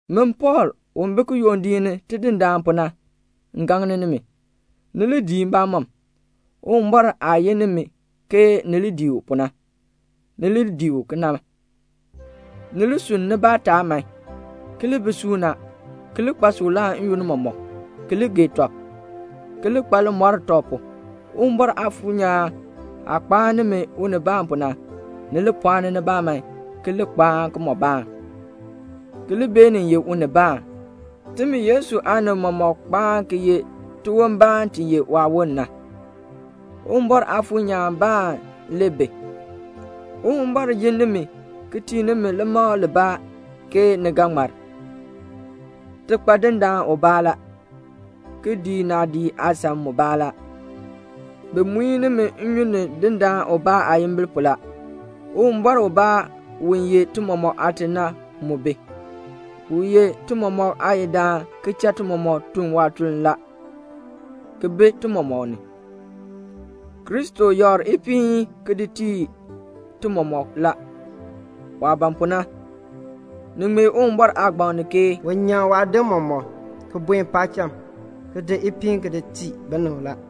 Min Pɔɔl, u bi kiyondiik ni Tidindaan pu na, m gaŋ nimi, ni li dii mbamɔm. Uwumbɔr aah yin nimi ke ni li dii u pu na, ni li dii u kena. Ni li sunn nibaa taab man, ki li bi suuna, ki li kpa suklaa n-yoonn mɔmɔk, ki li gee tɔb, ki li kpa limɔr tɔb pu. Uwumbɔr Aafuur nyaan aah kpaan nimi unibaan pu na, ni li pɔɔni nibaa man, ki li kpaan kimɔbaan, ki li beenin ye unibaan. Timi Yesu aanib mɔmɔk kpaan ki ye tiwon baan ti ye waawon na. Uwumbɔr Aafuur nyaan baan le bi. Uwumbɔr yin nimi ki tii nimi limakl libaa ke ni ga ŋmar. Ti kpa Dindaan ubaa la, ki dii naadii aasan mubaa la. Bi muin nimi nnyun ni Dindaan ubaa aayimbil pu la. Uwumbɔr ubaa u ye ti mɔmɔk Aate na mu bi. U ye ti mɔmɔk Aayidaan ki cha ti mɔmɔk tun waatuln la, ki bi ti mɔmɔk ni. Kristo yakr ipiin ki di tii ti mɔmɔk la, waah ban pu na. Ni ŋmee Uwumbɔr aagbaŋ ni ke "U nyaŋ waadim mɔmɔk, ki buen paacham; ki di ipiin ki di tii binib la."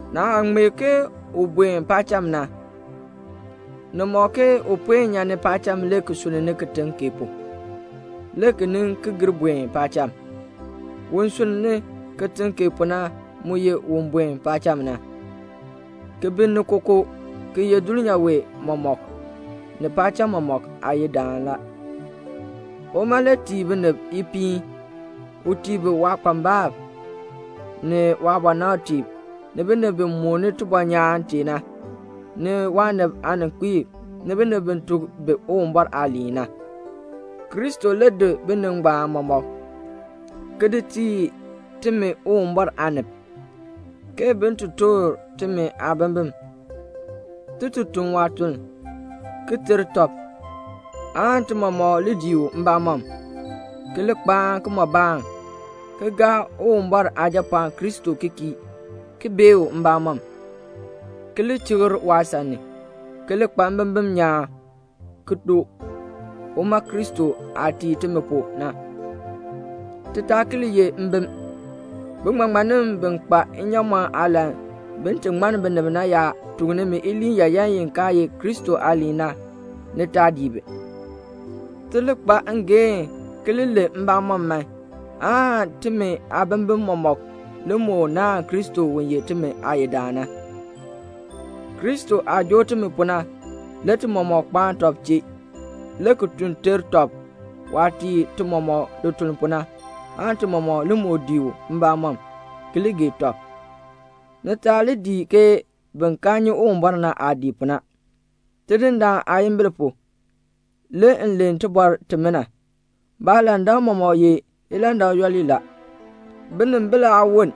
Naah ŋmee ke u buen paacham na, ni ŋmɔk ke u puen nyan paacham le ki sunn ni kitiŋ kee pu, le ki nin ki gir buen paacham. Un sunn ni kitiŋ kee pu na mu ye un buen paacham na, ki bi ni kookoo, ki ye dulnyaa wee mɔmɔk, ni paacham mɔmɔk Aayidaan la. Uma le tii binib ipiin. U tii bi waakpambalb, ni waabɔnabtiib, ni binib bi mooni tibɔnyaan tee na, ni waanib aaninkpiib, ni binib bi tuk bi Uwumbɔr aaliin na. Kristo le di binib ngbaan mɔmɔk, ki di tii timi Uwumbɔr aanib, ke bin ti toor timi aabimbin, ti ti tun waatuln, ki ter tɔb, aan ti mɔmɔk li dii u mbamɔm, ki li kpaan kimɔbaan, ki gaa Uwumbɔr Aajapɔɔn Kristo ki kii, ki bee u mbamɔm, ki li chikr waasan ni, ki li kpa mbimbin nyaan ki doo, uma Kristo aah tii timi pu na. Ti taa ki li ye mbim. Biŋmaŋmannim bi kpa nnyaamɔn aalan bin ti ŋmann binib na yaa tuk nimi iliin yaayan i kaa ye Kristo aaliin na, ni taa dii bi. Ti li kpa ngeehn ki li len mbamɔn man, aan timi aabimbin mɔmɔk li moo naahn Kristo u ye timi Aayidaan na. Kristo aah joo timi pu na, le ti mɔmɔk kpaan tɔb chee, le ki tun ter tɔb waah tii ti mɔmɔk lituln pu na, aan ti mɔmɔk li moo dii u mbamɔm, ki li gee tɔb. Ni taa li dii ke bin kaa nyi Uwumbɔr na aah dii pu na. Tidindaan aayimbil pu, le m len tibɔr timina. Baalandak mɔmɔk ye ilandak yooli la. Binimbil aa woln.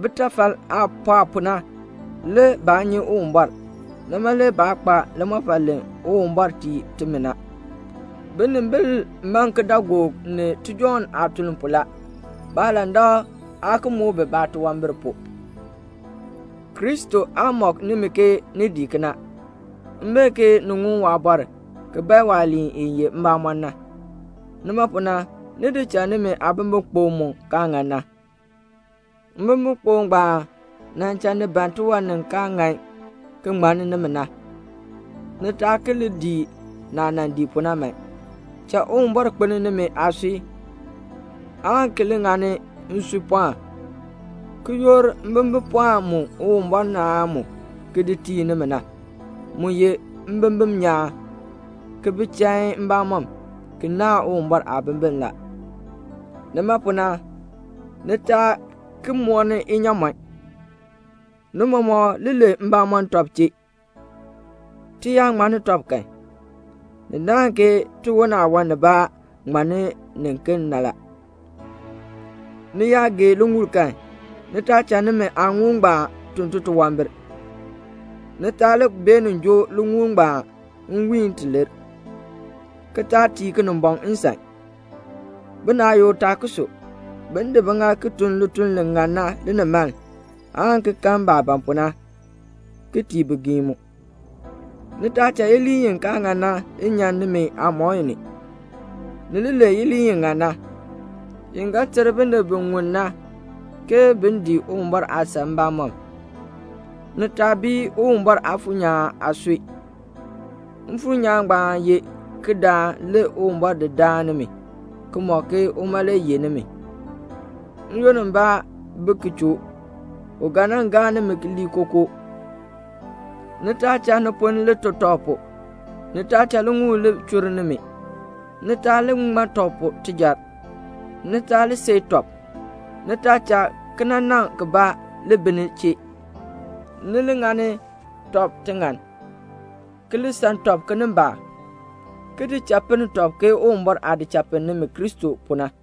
Bitafal aah pɔɔ pu na, le baa nyi Uwumbɔr. Nima le baa kpa limɔfal li Uwumbɔr tii timi na. Binimbil man kidaagook ni tijɔŋ aatuln pu la. Baalandak aa ki muk bi titunwambir pu. Kristo aa mɔk nimi ke ni dii kena. M bee ke ni ŋun waabɔr ki bae waaliin i ye mbamɔn na. Nima pu na ni di cha nimi aabimbikpok mu kaa ŋan na. Mbimbikpok ngbaan nan cha ni ban tiwan ni kaa ŋan ki ŋmann nimi na. Ni taa ki li dii naah nan dii pu na man. Cha Uwumbɔr kpelni nimi aasui aan ki li ŋani nsuipɔɔn, ki yoor mbimbipɔɔn mu Uwumbɔr naan mu ki di tii nimi na. Mu ye mbimbin nyaan, ki bi chain mbamɔm, ki naahn Uwumbɔr aabimbin la. Nima pu na, ni taa ki mɔni inyaamɔn. Ni mɔmɔk li len mbamɔn tɔb chee. Ti yaa ŋmanni tɔb kan, ni naahn ke tiwon aawan nibaa ŋmanni niken na la. Ni yaa gee liŋuul kan, ni taa cha nimi aaŋuul ngbaan tun titunwambir. Ni taa li beenin joo liŋuul ngbaan nwiin ti lir, ki taa tii Kinimbɔŋ nsan. Binaayukb taa ki su. Bin di biŋaal ki tun lituln li ŋan na linimaln, aan ki kan baah ban pu na, ki tii bigiim mu. Ni taa cha iliin i kaa ŋan na nyan nimi aamɔi ni. Ni li len iliin i ŋan na, i ga ter binib bi ŋun na ke bin dii Uwumbɔr aasan mbamɔm. Ni taa bii Uwumbɔr Aafuur nyaan aasui. Mfuur nyaan ngbaan ye kidaan, le Uwumbɔr di daan nimi, ki mɔk ke uma le yeh nimi. N-yoonn mbaa bi ki choo, u ga nan gaa nimi lii kookoo. Ni taa cha niponn ni li to tɔb pu; ni taa cha liŋuul li chur nimi; ni taa li ŋma tɔb pu tijar; ni taa li seei tɔb; ni taa cha kinanaŋ kibaa ki li bi ni chee. Ni li ŋani tɔb tiŋann, ki li san tɔb kinimbaak, ki di cha pinn tɔb ke Uwumbɔr aah di cha pinn nimi Kristo pu na.